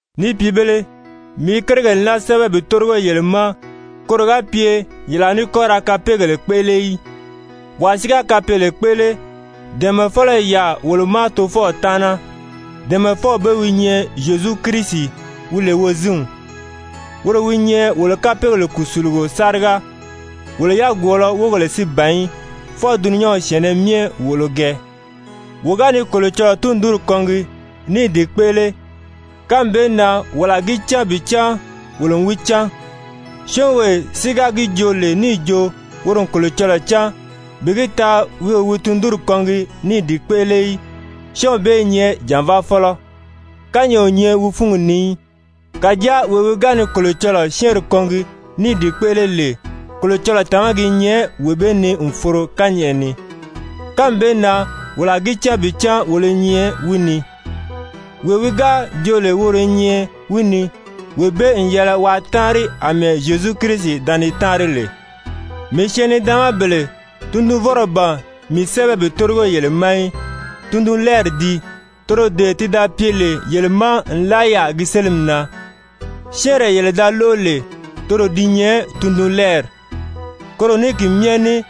Ni pìibēle, mii i kérigèle naa sɛ́bɛ bi tórigo yele ma koro ga pye yele a ní kɔ́ ra kapeegèle kpéʔele í. Wàa si ga kapeele kpéʔele, dɛ̀ɛmɛfɔlɔ i yaà wolo ma Tofɔw taana, dɛ̀ɛmɛfɔw bee wi nyɛ Zyezu Kirisi wi lè Wozinw. Woro wi nyɛ wolo kapeegèle kùsulugo sáriga, wolo yagwɔɔlɔ wógèle si ban í, fwɔɔ dulunyanw syɛ̀ɛnnɛ myɛ wòʔolo gɛɛ. Wo ga ni Kolocɔlɔɔ tundunri kɔngi ní i di kpéʔele, kánmi bee na wolo a gi cán bi cán wolo n wi cán. Syɔ́ɔnwee si ga gi joo lè níì jo woro n Kolocɔlɔɔ cán, bi gi taa wi o wi tundunri kɔngi ní i di kpéʔele í, syɔ́ɔnw bee i nyɛ jànvaafɔlɔ, kányɛʔɛ o nyɛ wi fúngi ni í. Kàjáa wee wi ga ni Kolocɔlɔɔ syɛ́ɛnri kɔngi ní i di kpéʔele lè, Kolocɔlɔɔ tàmagi i nyɛ wee bee ni n foro kányɛʔɛ ni. Kánmi bee na wolo a gi cán bi cán wolo i nyɛ wi ni. Wee wi ga joo lè woro i nyɛ wi ni, wee bee n yɛlɛ waa táanri àmɛɛ Zyezu Kirisi da ni táanri lè. Mii syɛɛn-nidaanmabèle, tundunvɔ́nrɔ ban mii sɛ́bɛ bi tórigo yele ma í, tundunlɛɛri dii, toro dee ti da pye lè yele ma nlaa yaà gi sélimi na. Syɛ́ɛnree yele da lóʔo lè, toro di nyɛ tundunlɛɛri. Koro ní ki myɛ ní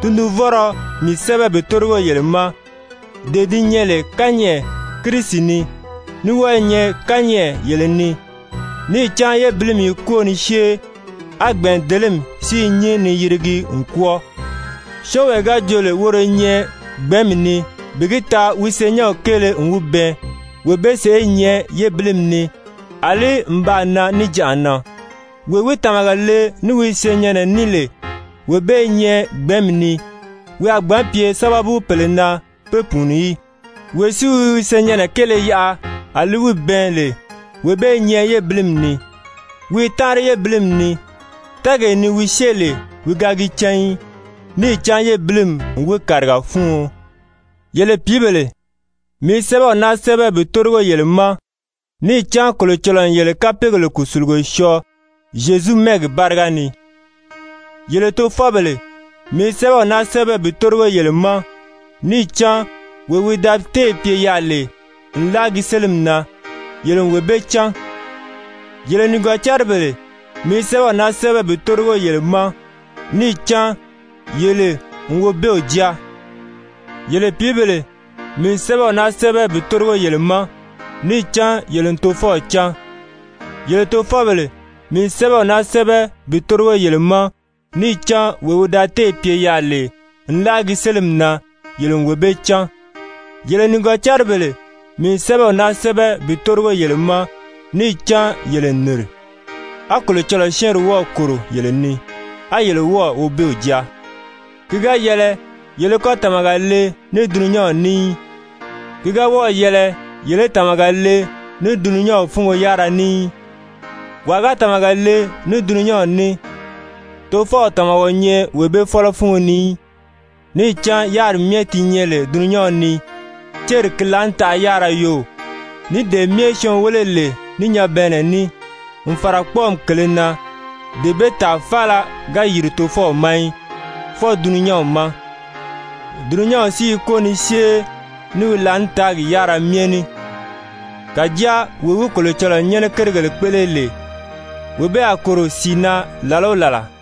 tundunvɔ́nrɔ mii sɛ́bɛ bi tórigo yele ma, dee di nyɛ lè kányɛʔɛ Kirisi ni, ní wɔ́ɔ i nyɛ kányɛʔɛ yele ni. Níì cán yébilimi i kwóo ni syée, á gbɛ̀ɛndelemi si i nyín ni yirigi n kwɔ́ɔ. Syɔ́ɔnwee ga jo lè woro i nyɛ gbɛ̀ɛ́nmi ni bi gi taa wi senyɛnw kéele n wi bɛɛn wee bee sèʔé i nyɛ yébilimi ni àlí n baa nan níjanʔa na. Wee wi tàmaga le ní wi senyɛnnɛ ní lè, wee bee i nyɛ gbɛ̀ɛ́nmi ni, wi a gbǎn pye sábabu pèle na be pùuni í. Wee si wi wi senyɛnnɛ kéele yaʔa a li wi bɛɛn lè, wee bee i nyɛ yébilimi ni. Wi i táanri yébilimi ni, tɛ́ɛgee ni wi syée lè wi ga gi cán í, níì cán yébilimi n wi kàriga fúuɔn. Yele pìíbèle, mii i sɛ́bɛw naa sɛ́bɛ bi tórigo yele ma, níì cán Kolocɔlɔɔ n yele kapeegèle kùsulugo syɔɔ Zyezu mɛ́ɛgi báriga ni. Yele tofɔbèle, mii i sɛ́bɛw naa sɛ́bɛ bi tórigo yele ma, níì cán wee wi da téè pye yaà lè nlaa gi sélimi na, yele n wee bee cán. Yele nìgɔcaribèle, mii i sɛ́bɛw naa sɛ́bɛ bi tórigo yele ma, níì cán yele n Wobeew jáa. Yele pìíbèle, mii n sɛ́bɛw naa sɛ́bɛ bi tórigo yele ma, níì cán yele n Tofɔw cán. Yele tofɔbèle, mii n sɛ́bɛw naa sɛ́bɛ bi tórigo yele ma, níì cán wee wi da téè pye yaà lè nlaa gi sélimi na, yele n wee bee cán. Yele nìgɔcaribèle, mii n sɛ́bɛw naa sɛ́bɛ bi tórigo yele ma, níì cán yele n nìri, a Kolocɔlɔɔ syɛ́ɛnri wɔ́ɔ̀ kòro yele ni, a yele wɔ́ɔ̀ Wobeew jáa. Ki ga yɛlɛ yele í kɔ́ tàmaga le ní dulunyanw ní í, ki ga wɔ́ɔ̀ yɛlɛ yele í tàmaga le ní dulunyanw fúngo yárira ní í. Wàa ga tàmaga le ní dulunyanw ní, Tofɔw tàmaga o nyɛ wee bee fɔ́lɔ fúngo ni í. Níì cán yáriri myɛ di nyɛ lè dulunyanw ni, céri ki laànitaʔa yárira yoo, ní dee myɛ syɔɔn wéle lè ní nyabɛɛnnɛ ní, n fàra kpɔ́ɔmi kèlē na, dee bee tàa faala ga yìri Tofɔw ma í, fwɔɔ dulunyanw ma. Dulunyanw si i kwóo ni syée ní wi laànitaagi yárira myɛ ní. Kàjáa wee wi Kolocɔlɔɔ nyɛ́nɛ kérigèle kpéʔele lè, wee bee a kòro sìi na làla o làla.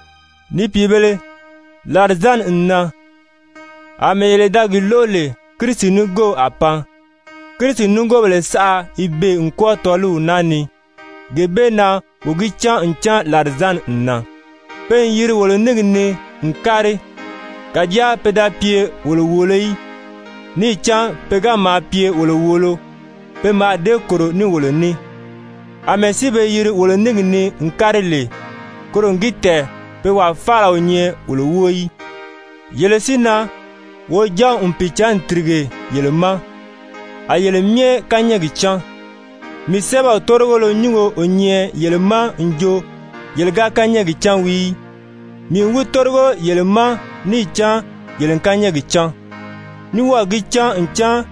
Ni pìibēle, làrizanni n nan. Amɛɛ yele da gi lóʔo lè Kirisi nigoow a pan, Kirisi nigoobèle saʔa i beè n kwɔ́ɔ tɔ́ɔliw naa ni, gee bee na wo gi cán ncan làrizanni n nan. Pe n yiri wolo níngi ni n kári, kàjáa pe da pye wolo wòolo í. Níì cán pe ga maa pye wolo wòolo, pe mǎà dée kòro ní wolo ní. Amɛɛ si be yiri wolo níngi ni n kári lè, koro n gi tɛ̀ɛn pe wàa faala o nyɛ wolo wóo í. Yele si na, Wojanw n Pìicǎnni tìrige yele ma, a yele myɛ kányɛɛgi cán. Mii sɛ́bɛw tórigolo nyúngo o nyɛ yele ma n jo yele ga kányɛɛgi cán wii í, mii n wi tórigo yele ma níì cán yele n kányɛɛgi cán, ní wɔ́ɔ̀ gi cán ncan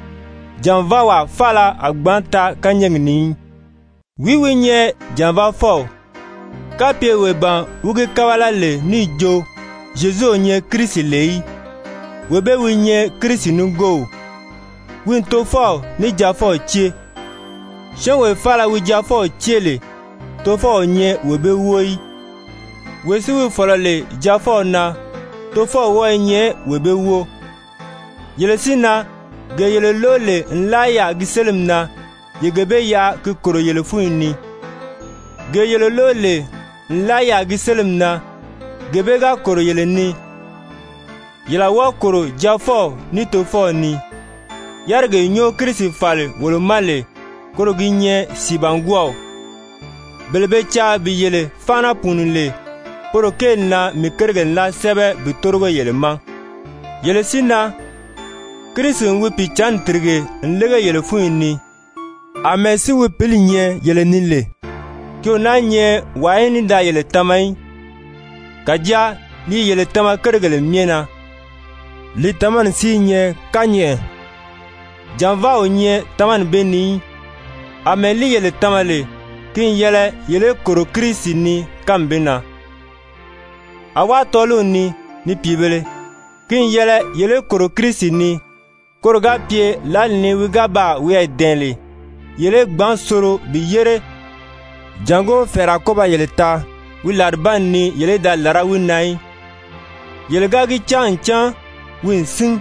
jànvaawaa faala a gbǎn taa kányɛɛgi ni í. Wìí wi nyɛ jànvaafɔw, kapye wee ban wi gi kábala lè níì jo Zyezu o nyɛ Kirisi lè í? Wee bee wi nyɛ Kirisi nigoow, wi n Tofɔw ní Jaafɔw cée. Syɔ́ɔnwee faala wi Jaafɔw cée lè, Tofɔw o nyɛ wee bee wóo í. Wee si wi fɔ̀lɔ lè Jaafɔw na, Tofɔw wɔ́ɔ i nyɛ wee bee wóo. Yele si na, gee yele lóʔo lè nlaa yaà gi sélimi na, ye gee bee yaʔa gi kòro yele fúnyi ni. Gee yele lóʔo lè nlaa yaà gi sélimi na, gee bee ga kòro yele ni, yele a wɔ́ɔ kòro Jaafɔw ní Tofɔw ni. Yárigee nyɔ́ɔ Kirisi fàli wolo ma lè, koro gi nyɛ sìibangwɔɔw. Bele be caa bi yele fáana pùuni lè, poro kéeli na mii kérigèle naa sɛ́bɛ bi tórigo yele ma. Yele si na, Kirisi n wi Pìicǎnni tìrige n lége yele fúnyi ni, àmɛɛ si wi Pǐli nyɛ yele ni lè, ki o náā nyɛ wàa í ní da yele tama í. Kàjáa li i yele tama kérigèle myɛ na, li tamani si i nyɛ kányɛʔɛ, jànvaa o nyɛ tamani bee ni í. Amɛɛ li yele tama lè, ki n yɛlɛ yele í kòro Kirisi ni kánmi bee na. Awá tɔ́ɔliw ni, ni pìibēle, ki n yɛlɛ yele í kòro Kirisi ni, koro ga pye lǎli ni wi ga baa wiyɛɛ dɛ̀ɛn lè, yele í gbǎn soro bi yére, jàngó fɛ̀ɛrɛ a kɔ́ ba yele taa wi làribanni ni yele í da làrá wi na í. Yele ga gi cán ncan wi n sín,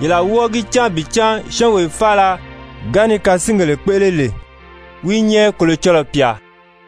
yele a wɔ́ɔ gi cán bi cán syɔ́ɔnwee faala ga ni kasingèle kpéʔele lè, wi i nyɛ Kolocɔlɔɔ pyà.